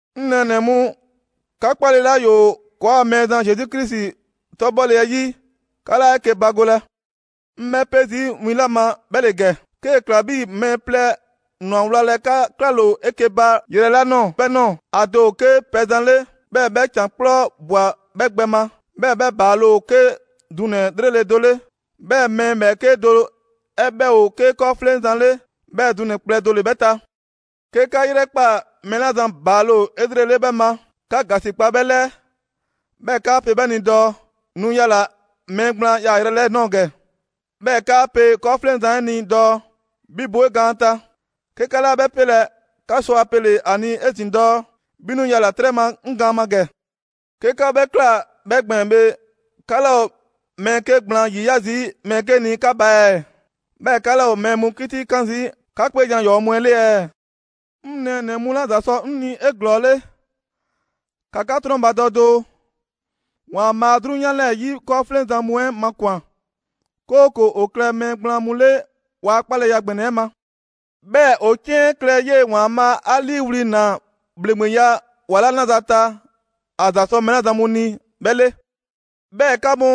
'Ŋ nɛɛnɛ‑ mu, 'ka 'kpale‑ 'la ‑yoo ‑kɔɔa' Mɛɛzan Zesu Krisi 'tɔbhɔle 'ɛ 'yi, 'ka 'laa 'eke‑ bagolɛ. 'Ŋ 'bhɛ 'pe zii' win 'la ma, 'bhɛ ‑le ‑gɛ: 'kee‑ ꞊kla 'bhii‑ mɛɛ plɛ ‑nwa wlalɛ 'ka 'klale‑ o 'eke‑ ba yrɛ 'la ꞊nɔɔ 'bhɛ ꞊nɔɔ. ‑A do ‑o 'ke pɛzan 'le, 'bhɛɛ‑ 'bhɛ ‑can 'kplɔ ꞊bwa 'bhɛ gbɛ ma, 'bhɛɛ‑ 'bhɛ ‑baale' ‑o 'ke dunɛ‑ 'lrele‑ do 'le. 'Bhɛɛ‑ mɛɛ ‑bhɛɛke' do 'ɛ 'bhɛ ‑o 'ke 'kɔɔfleŋzan 'le, 'bhɛɛ‑ dunɛ‑ kplɛ do ‑le 'bhɛ ta. 'Ke 'ka 'yrɛkpaa‑ mɛɛ 'la zan ‑baale' ‑o 'elrele 'bhɛ ma, 'ka ‑gasikpa 'bhɛ 'lɛɛ, 'bhɛɛ‑ 'kaa pe 'bhɛ ni dɔɔ: «Nu yala‑ mɛɛ gblaan yaayrɛ 'lɛɛ‑ ꞊nɔɔ ‑gɛ.» 'Bhɛɛ‑ 'kaa pe 'kɔɔfleŋzan 'ɛ ni dɔɔ: «'Bhi, bo 'e gaan ta». 'Ke 'ka 'laa 'bhɛ 'pelɛ‑, 'ka sɔ ‑a pele‑ ‑a ni 'ezin‑ dɔɔ: «'Bhi 'nu 'yala‑ 'trɛ ma 'ŋ gaan ma ‑gɛ.» 'Ke 'ka 'bhɛ ꞊kla 'bhɛ gbɛɛn‑ bhe, 'ka 'laa ‑o mɛɛ 'ke gblaan ‑yiya' zii' mɛɛ 'ke ni 'ka ba ɛɛ? 'Bhɛɛ‑ 'ka 'laa ‑o mɛɛ mu 'kitikan zii' 'ka 'kpeejan‑ ‑yɔɔ' mu 'ɛ 'le ɛɛ? 'Ŋ nɛɛnɛ‑ mu 'la ‑za sɔ 'ŋ ni 'eglɔɔle, ‑ka 'ka 'trɔnbadɔ doo: ‑Waanbhaa 'drunyan 'lɛɛ‑ 'yi 'kɔɔfleŋzan mu 'ɛ makwan‑, 'kooko‑ ‑o klɛ mɛɛ gblaan mu 'le ‑waa' 'kpaleya ‑gbɛnɛ 'ɛ ma; 'bhɛɛ‑ ‑o 'ciɛn klɛ 'yee‑ ‑Waanbhaa' 'a 'liiwli‑ ꞊naa ‑bhleŋgbeya ‑wa 'la 'naza‑ ta ‑a ‑za sɔ mɛɛ 'la zan mu ni 'bhɛ 'le. 'Bhɛɛ‑ 'ka mu,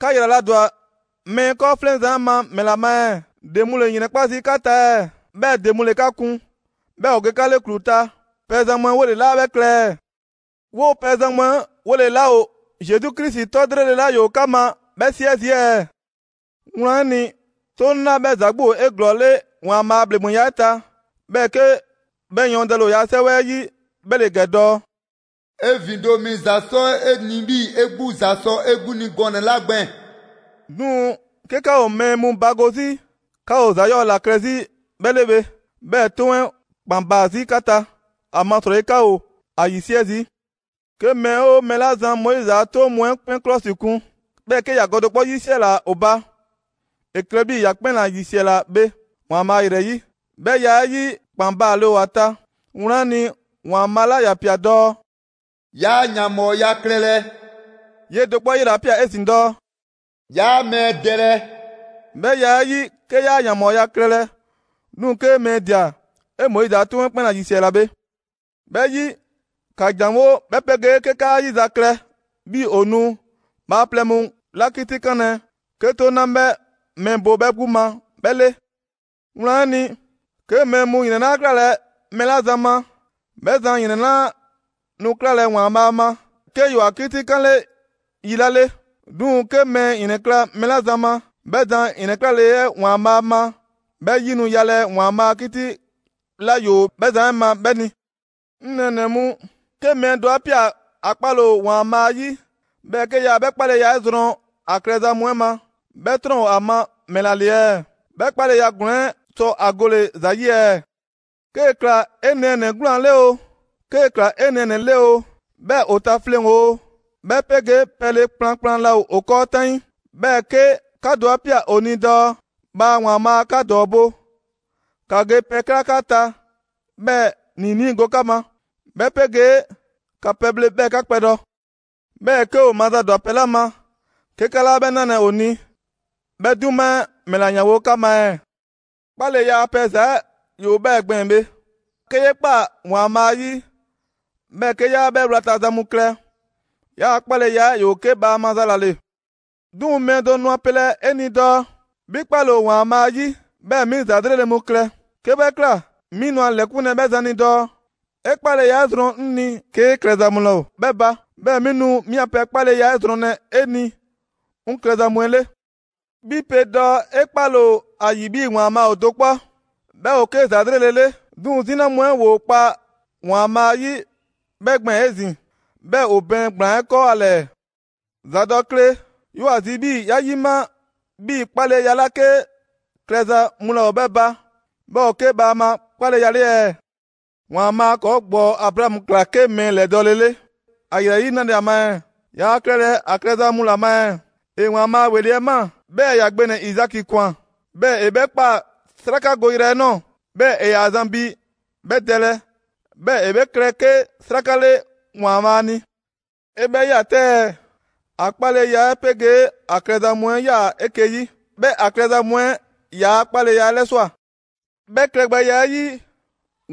'ka ‑yraladwa mɛɛ 'kɔɔfleŋzan 'ɛ ma ‑mɛla ma ɛɛ? ‑De mu ‑le ‑yrɛnkpa' zii' 'ka ta ɛɛ, 'bhɛɛ‑ ‑de mu ‑le 'ka 'kun 'bhɛɛ‑ ‑o ge 'ka 'le ‑klu ta, pɛzan mu 'ɛ 'wole‑ 'laa 'bhɛ klɛ ɛɛ? 'Woo‑ pɛzan mu 'ɛ 'wole‑ 'laa ‑o Zesu Krisi 'tɔ 'lrele‑ 'la ‑yoo 'ka ma 'bhɛ 'siɛ zii' ɛɛ? Wlan 'ɛ ni, 'toŋ 'la 'bhɛ ‑za 'gbu ‑o 'eglɔɔle ‑Waanbhaa' a ‑bhleŋgbeya 'ɛ ta, 'bhɛɛ‑ 'ke 'bhɛ yɔɔndɛle ‑o ‑yaa' 'Sɛwɛ 'ɛ 'yi 'bhɛ ‑le ‑gɛ dɔɔ: «'E ‑vindo' mi ‑za 'sɔ 'e ni 'bhii‑ 'e 'gbu ‑za sɔ 'e 'gbu ni gɔnɛ‑ 'la gbɛɛn‑.» 'Duŋ‑ 'ke 'ka ‑o mɛɛ mu bago 'zi, 'ka ‑o ‑za 'yɔɔ‑ ‑la klɛ 'zi 'bhɛ 'le bhe. 'Bhɛɛ‑ 'toŋ 'ɛ ‑kpan baa‑ 'zi 'ka ta, ‑amasrɔyi 'ka ‑o ‑a 'yisiɛ zii'. 'Ke mɛɛ 'oo mɛɛ 'la zan Moizi a 'toŋ mu 'ɛ 'kpɛn 'klɔsikun, 'bhɛɛ‑ 'ke ‑ya gɔ do 'kpɔ 'yisiɛla ‑o ba, ‑e klɛ 'bhii‑ ‑ya 'kpɛn ‑la ‑yisiɛla bhe ‑Waanbhaa' ‑yrɛ 'yi. 'Bhɛ ya 'ɛ 'yi, ‑kpan baale ‑o ‑a ta. Wlan 'ɛ ni, ‑Waanbhaa' 'la ‑ya ꞊pia dɔɔ: «'Yaa ‑yanbhɔɔya klɛlɛ,» 'yee‑ do 'kpɔ 'ɛ 'yela‑ ꞊pia 'ezin‑ dɔɔ: «'Yaa mɛɛ dɛlɛ.» 'Bhɛ ya 'ɛ 'yi, 'ke 'yaa ‑yanbhɔɔya klɛlɛ, 'duŋ‑ 'kee mɛɛ ꞊dia, ‑e Moizi a 'toŋ 'ɛ 'kpɛn ‑la ‑yisiɛla bhe. 'Bhɛ 'yi, ‑ka ‑janwo' 'bhɛ 'pegee 'ke 'ka 'a 'yizaklɛ 'bhii‑ ‑o nu bhaaplɛŋ mu 'la 'kitikanlɛ 'ke 'toŋ 'la 'bhɛ mɛɛ bo 'bhɛ 'gbu ma 'bhɛ 'le. Wlan 'ɛ ni, 'ke mɛɛ mu ‑yrɛn 'laa 'klalɛ‑ mɛɛ 'la zan ma, 'bhɛ zan ‑yrɛn 'laa nu 'klalɛ‑ ‑Waanbhaa' ma, 'ke ‑yoo ‑a 'kitikanle yi 'la 'le. 'Duŋ‑, 'ke mɛɛ ‑yrɛnkla' mɛɛ 'la zan ma, 'bhɛ zan ‑yrɛnklale 'ɛ ‑Waanbhaa ma 'bhɛ 'yi nu yalɛ ‑Waanbhaa' a 'kiti 'la ‑yoo 'bhɛ zan 'ɛ ma 'bhɛ ni. 'Ŋ nɛɛnɛ‑ mu, 'ke mɛɛ do 'a ꞊pia dɔɔ ‑a 'kpale‑ ‑o ‑Waanbhaa' 'yi, 'bhɛɛ‑ 'ke yaa 'bhɛ 'kpaleya 'ɛ zrɔn ‑a klɛza mu 'ɛ ma, 'bhɛ 'trɔn‑ ‑o ‑a ma ‑mɛla ‑le ɛɛ? 'Bhɛ 'kpaleya ‑glɔɔn 'ɛ sɔ ‑a gole‑ ‑za 'yi ɛɛ? 'Kee‑ ꞊kla 'e nɛɛnɛ‑ 'gwlaan‑ 'le oo, 'kee‑ ꞊kla 'e nɛɛnɛ‑ 'le oo, 'bhɛɛ‑ ‑o ta fleŋ‑ ‑o, 'bhɛ 'pegee pɛle kplankplan laa ‑o 'kɔɔ 'taŋii, 'bhɛɛ‑ 'ke 'ka do 'a ꞊pia ‑o ni dɔɔ: «Bhaa ‑Waanbhaa' 'ka ‑dɔɔbo'! ‑Ka ge pɛ ꞊kla 'ka ta 'bhɛɛ‑ ‑niinii' go 'ka ma, 'bhɛ 'pegee ‑ka pɛbhle 'bhɛɛ‑ 'ka kpɛdɔ.» 'Bhɛɛ‑ 'ke ‑o mazadwa pɛ 'la ma, 'ke 'ka 'laa 'bhɛ 'nalɛ‑ ‑o ni, 'bhɛ 'duma 'ɛ ‑mɛla 'yanwo‑ 'ka ma ɛɛ? 'Kpaleya a pɛ ‑za 'ɛ ‑yoo 'bhɛɛ‑ gbɛɛn‑ bhe. 'Ke 'yee 'kpa ‑Waanbhaa' 'yi, 'bhɛɛ‑ 'ke 'yaa 'bhɛ 'wlata‑ za mu klɛ, 'yaa‑ 'kpaleya 'ɛ ‑yoo 'ke bhaama za ‑la ‑le. 'Duŋ‑ mɛɛ do nu ‑a pelɛ 'e ni dɔɔ: «'Bhi 'kpale‑ ‑o ‑Waanbhaa' 'yi, 'bhɛɛ‑ 'mi ‑za 'lrele‑ mu klɛ!» 'Ke 'bhɛ ꞊kla, 'mi nu ‑a ‑lɛkunlɛ 'bhɛ zan ni dɔɔ: «'E 'kpaleya 'ɛ zrɔn 'ŋ ni 'kee klɛza mu laa ‑o 'bhɛ ba; 'bhɛɛ 'mi nu 'mi a pɛ 'kpaleya 'ɛ zrɔnlɛ 'e ni 'ŋ klɛza mu 'ɛ 'le.» 'Bhi pe dɔɔ 'e 'kpale‑ ‑o ‑a ‑yi 'bhii‑ ‑Waanbhaa' ‑o do 'kpɔ, 'bhɛ ‑o 'ke ‑za 'lrele‑ 'le. 'Duŋ‑ 'zina mu 'ɛ ‑woo kpa ‑Waanbhaa' yi 'bhɛɛ‑ gbɛɛn‑ 'ezin‑, 'bhɛɛ‑ ‑o bɛɛn ‑gblaan 'ɛ 'kɔɔ ‑a ‑lɛɛ. ‑Zadɔkle! 'Yoo‑ ‑a zi 'bhii‑ 'ya 'yima 'bhii‑ 'kpaleya 'la 'ke klɛza mu laa ‑o 'bhɛ ba, 'bhɛ ‑o 'ke bhaama 'kpaleya 'le ɛɛ? ‑Waanbhaa' ‑kɔɔ' ‑gbɔɔ Abraamu ꞊kla 'ke mɛɛ ‑lɛdɔɔle ‑a ‑yrɛ 'yi 'nale‑ ‑a ma ɛɛ? Yaa klɛlɛ ‑a klɛza mu ‑la ma ɛɛ? ‑E ‑Waanbhaa' ‑weli' 'ɛ ꞊maa, 'bhɛɛ‑ ‑ya gbe ‑nɛ Izaki ‑kwan, 'bhɛɛ‑ ‑e 'bhɛ ꞊kpaa 'srakagoyrɛ 'ɛ ꞊nɔɔ, 'bhɛɛ‑ ‑e ‑yaa zan bi 'bhɛ dɛlɛ, 'bhɛɛ‑ ‑e 'bhɛ klɛ 'ke 'sraka 'le ‑Waanbhaa' ni. 'E 'bhɛ ꞊ya 'tɛ ɛɛ! ‑A 'kpaleya 'ɛ 'pegee ‑a klɛza mu 'ɛ 'yaa‑ 'eke‑ 'yi. 'Bhɛɛ‑ ‑a klɛza mu 'ɛ ‑yaa' 'kpaleya 'ɛ 'lɛswa꞊. 'Bhɛ klɛgbɛya 'ɛ 'yi,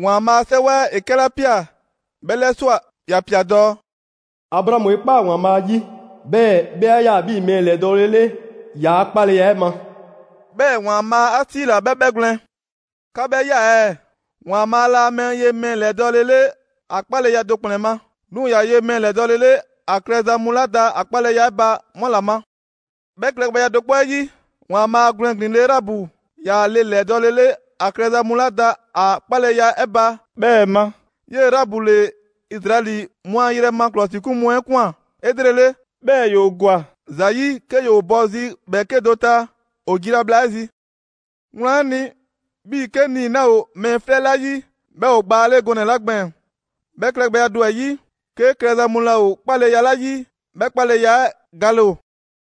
‑Waanbhaa' a 'Sɛwɛ ‑e 'kɛla ꞊pia 'bhɛɛ‑ 'lɛswa꞊, ‑ya ꞊pia dɔɔ: «Abraamu 'e ꞊kpaa ‑Waanbhaa' 'yi, 'bhɛɛ‑ 'bhɛ 'a ꞊ya 'bhii‑ mɛɛ ‑lɛdɔɔle 'le ‑yaa' 'kpaleya 'ɛ ma.» 'Bhɛɛ‑ ‑Waanbhaa' 'a 'siila‑ 'bhɛ 'bhɛgwlɛn‑. 'Ka 'bhɛ ꞊ya ɛɛ! ‑Waanbhaa' laa mɛɛ ye mɛɛ ‑lɛdɔɔle 'le ‑a 'kpaleya do ‑kplɛn ma, 'duŋ‑ ‑ya ye mɛɛ ‑lɛdɔɔle 'le ‑a klɛza mu 'la da ‑a 'kpaleya 'ɛ ba 'mu ‑la ma. 'Bhɛ klɛgbɛya do 'kpɔ 'ɛ 'yi, ‑Waanbhaa' gwlɛn ‑glin le Raabu ꞊ya le ‑lɛdɔɔle 'le ‑a klɛza mu 'la da ‑a 'kpaleya 'ɛ ba 'bhɛɛ‑ ma. 'Yee‑ Raabu ‑le Izraɛli mu a yrɛ ma ‑klɔsikun mu 'ɛ ꞊kwan 'elrele, 'bhɛɛ‑ ‑yoo ‑gwa ‑za 'yi 'ke ‑yoo bɔ zi ‑bhɛɛke' do ta ‑o jila bhla 'ɛ zi. Wlan 'ɛ ni, 'bhii‑ 'ke nii‑ 'laa ‑o mɛɛ 'flɛ 'la 'yi, 'bhɛ ‑o gbaa 'le gɔnɛ‑ 'la gbɛɛn‑, 'bhɛ klɛgbɛya do 'ɛ yi, 'ke klɛza mu laa ‑o 'kpaleya 'la 'yi, 'bhɛ 'kpaleya 'ɛ gale ‑o.